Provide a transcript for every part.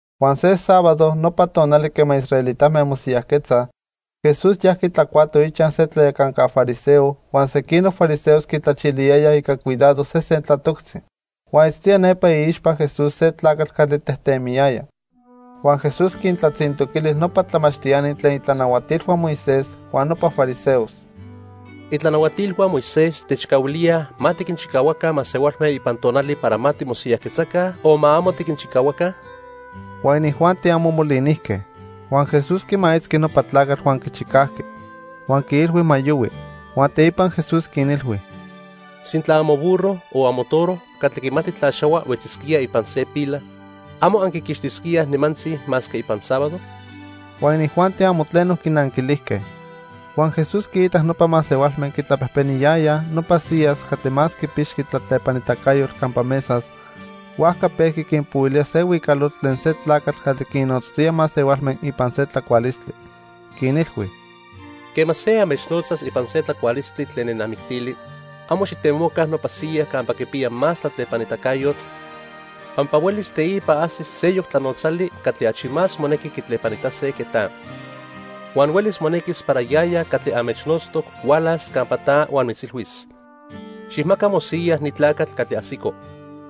Huan se sábado, nopa tonali quema israelitame mosiyajquetzaj, Jesús yajqui tlacuato ichaj se tlayacanca fariseo, huan sequinoc fariseos quitlachiliyayaj ica cuidado sesen tlatoctzi. Huan itztoya nepa iixpa Jesús se tlacatl catli tejtemiyaya. Huan Jesús quintlatzintoquili nopa tlamachtiani tlen itlanahuatilhua Moisés huan nopa fariseos: —¿Itlanahuatilhua Moisés techcahuilíaj ma tiquinchicahuaca masehualme ipan tonali para ma timosiyajquetzaca o ma amo tiquinchicahuaca? Huan inijuanti amo molinijque. Huan Jesús quimaitzqui nopa tlacatl huan quichicajqui. Huan quiilhui ma yohui. Huan teipa Jesús quinilhui: —Sintla amoburro o amotoro catli quimati tlaxahua huetzisquía ipan se pila, ¿amo anquiquixtisquíaj nimantzi masque ipan sábado? Huan inijuanti amo tleno quinanquilijque. Huan Jesús quiitac nopa masehualme quitlapejpeniyayaj nopa siyas catli más quipixqui tlatlepanitacayotl campa mesas, huajca pejqui quinpohuilía se huicalotl tlen se tlacatl catli quinnotztoya masehualme ipan se tlacualistli. Quinilhui: —Quema se anmechnotzas ipan se tlacualistli tlen nenamictili, amo xijtemoca nopa siya campa quipiya más tlatlepanitacayotl pampa huelis teipa ajsis seyoc tlanotzali catli achi más monequi quitlepanitase que ta. Huan huelis monequis para yaya catli anmechnotztoc hualas campa ta huan mitzilhuis: 'Xijmaca mosiya ni tlacatl catli ajsico.'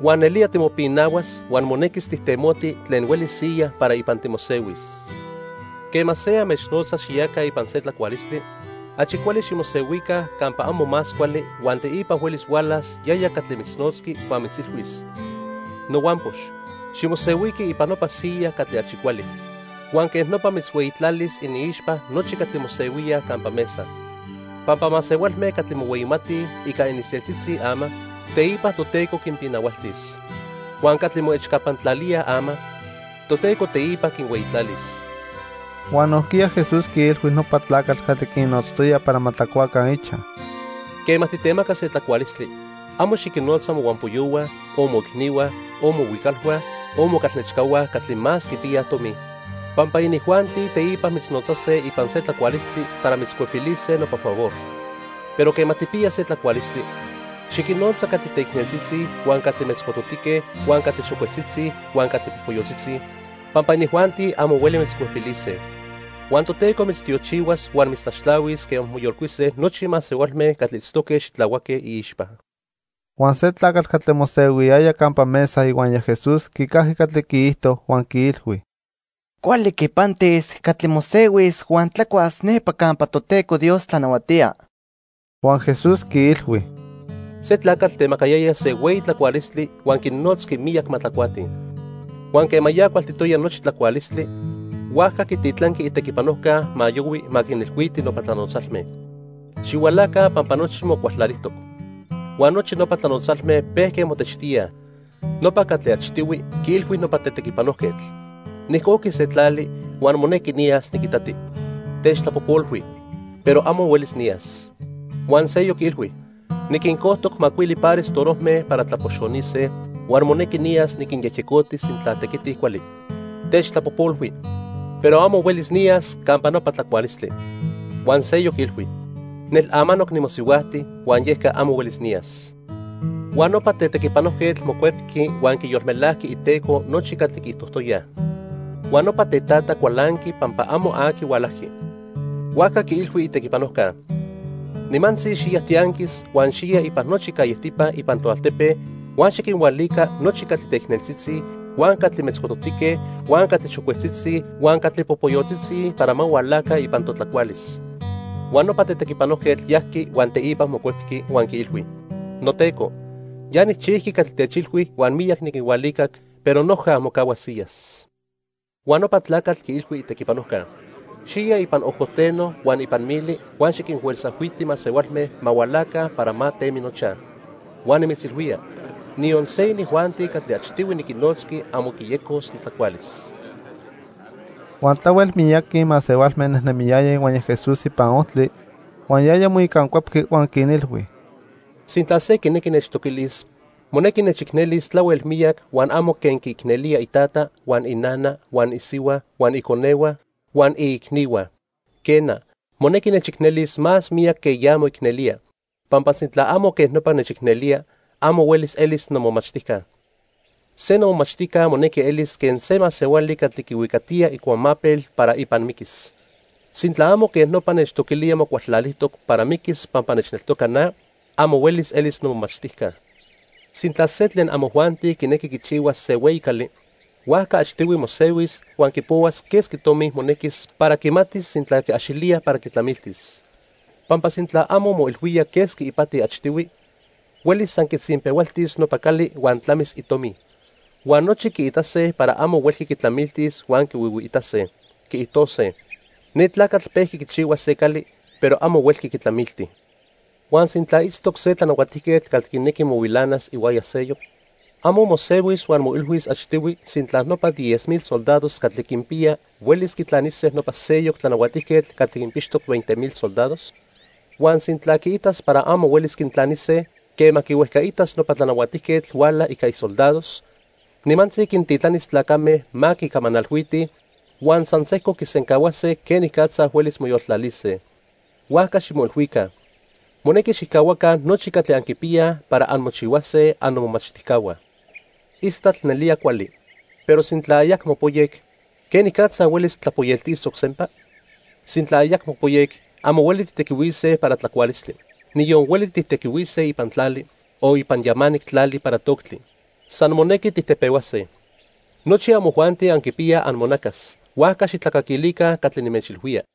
Huan nelía timopinahuas huan monequis tijtemoti tlen hueli siya para ipan timosehuis. Quema se anmechnotzas xiyaca ipan se tlacualistli, achi cuali ximosehuica campa amo más cuali huan teipa huelis hualas yaya catli mitznotzqui huan mitzilhuis: 'Nohuampox, ximosehuiqui ipan nopa siya catli achi cuali.' Huan quej nopa mitzhueyitlalis iniixpa nochi catli mosehuíaj campa mesa. Pampa masehualme catli mohueyimatij ica ininseltzitzi ama, teipa Toteco quinpinahualtis. Huan catli moechcapantlalíaj ama, Toteco teipa quinhueyitlalis. Huan nojquiya Jesús quiilhui nopa tlacatl catli quinnotztoya para ma tlacuaca ichaj: —Quema titemaca se tlacualistli, amo xiquinnotza mohuampoyohua, o moicnihua, o mohuicalhua, o mocalnechcahua catli más quipiyaj tomi, pampa inijuanti teipa mitznotzase ipan se tlacualistli para mitzcuepilise nopa favor. Pero quema tijpiya se tlacualistli, xiquinnotza catli teicneltzitzi huan catli metzcototique huan catli xocuetzitzi huan catli popoyotzitzi, pampa inijuanti amo hueli mitzcuepilise. Huan Toteco mitztiochihuas huan mitztlaxtlahuis quema moyolcuise nochi masehualme catli itztoque xitlahuaque iixpa. Huan se tlacatl catli mosehuiyaya campa mesa ihuaya Jesús quicajqui catli quiijto huan quiilhui: —Cuali quipantis catli mosehuis huan tlacuas nepa campa Toteco Dios tlanahuatía. Huan Jesús quiilhui: —Se tlacatl temacayaya se hueyi tlacualistli huan quinnotzqui miyac ma tlacuatij. Huan quema ya cualtitoya nochi tlacualistli, huajca quititlanqui itequipanojca ma yohui ma quinilhuiti nopa tlanotzalme: 'Xihualaca pampa nochi mocualtlalijtoc.' Huan nochi nopa tlanotzalme pejque motechtíaj. Nopa catli achtihui quiilhui nopa tetequipanojquetl: 'Nijcojqui se tlali, huan monequi niyas niquitati. Techtlapojpolhui, pero amo huelis niyas.' Huan seyoc quiilhui: 'Niquincojtoc macuili pares torojme para tlapoxonise, huan monequi niyas niquinyejyecoti sintla tequitij cuali. Techtlapojpolhui, pero amo huelis niyas campa nopa tlacualistli.' Huan seyoc quiilhui: 'Nel amanoc nimosihuajti huan yeca amo huelis niyas.' "Huan nopa tetequipanojquetl mocuepqui huan quiyolmelajqui iteco nochi catli quiijtojtoyaj. Huan nopa tetata cualanqui pampa amo aqui hualajqui. Huajca quiilhui itequipanojca: 'Nimantzi xiya tianquis huan xiya ipan nochi callejtipa ipan toaltepe, huan xiquinhualica nochi catli teicneltzitzi, huan catli metzcototique, huan catli xocuetzitzi huan catli popoyotzitzi para ma hualaca ipan totlacualis.' Huan nopa tetequipanojquetl yajqui huan teipa mocuepqui, huan quiilhui: 'Noteco, ya nijchijqui catli techilhui huan miyac niquinhualicac, pero noja mocahua siyas.' Huan nopa tlacatl quiilhui itequipanojca: 'Xiya ipan ojojteno huan ipan mili huan xiquinfuerzajhuiti masehualme ma hualaca para ma temi nochaj. Huan nimitzilhuía, niyon se inijuanti catli achtihui niquinnotzqui amo quiyecos notlacualis.' " Huan tlahuel miyaqui masehualme nejnemiyayaj ihuaya Jesús ipan ojtli, huan yaya moicancuepqui huan quinilhui: "Sintla se quinequi nechtoquilis, monequi nechicnelis tlahuel miyac huan amo quen quiicnelía itata, huan inana, huan isihua, huan iconehua, huan iicnihua. Quena, monequi nechicnelis más miyac que ya moicnelía, pampa sintla amo quen nopa nechicnelía, amo huelis elis nomomachtijca. Se nomomachtijca monequi elis quen se masehuali catli quihuicatiya icuamapel para ipan miquis. Sintla amo quej nopa nechtoquilía mocualtlalijtoc para miquis pampa nechneltoca na, amo huelis elis nomomachtijca. "Sintla se tlen amojuanti quinequi quichihuas se hueyi cali, huajca achtihui mosehuis huan quipohuas quesqui tomi monequis para quimatis sintla quiaxilía para quitlamiltis. Pampa sintla amo moilhuía quesqui ipati achtihui, huelis san quitzinpehualtis nopa cali huan tlamis itomi. Huan nochi quiitase para amo huelqui quitlamiltis huan quihuihuiitase. Quiijtose: 'Ne tlacatl pejqui quichihua se cali, pero amo huelqui quitlamilti.' "Huan sintla itztoc se tlanahuatijquetl catli quinequi mohuilanas ihuaya seyoc, ¿amo mosehuis huan moilhuis achtihui sintla nopa diez mil soldados catli quinpiya huelis quitlanise nopa seyoc tlanahuatijquetl catli quinpixtoc veinte mil soldados? Huan sintla quiitas para amo huelis quintlanise, quema quihuejcaitas nopa tlanahuatijquetl huala ica isoldados, nimantzi quintitlanis tlacame ma quicamanalhuitij, huan san sejco quisencahuase quenicatza huelis moyoltlalise. Huajca ximoilhuica, monequi xijcahuaca nochi catli anquipiyaj para anmochihuase annomomachtijcahua. "Istatl nelía cuali, pero sintla ayacmo poyec, ¿quenicatza huelis tlapoyeltisoc sempa? Sintla ayacmo poyec amo hueli tijtequihuise para tlacualistli. Niyon hueli tijtequihuise ipan tlali, o ipan yamanic tlali para toctli. San monequi tijtepehuase. Nochi amojuanti anquipiyaj amonacas, huajca xijtlacaquilica catli nimechilhuía."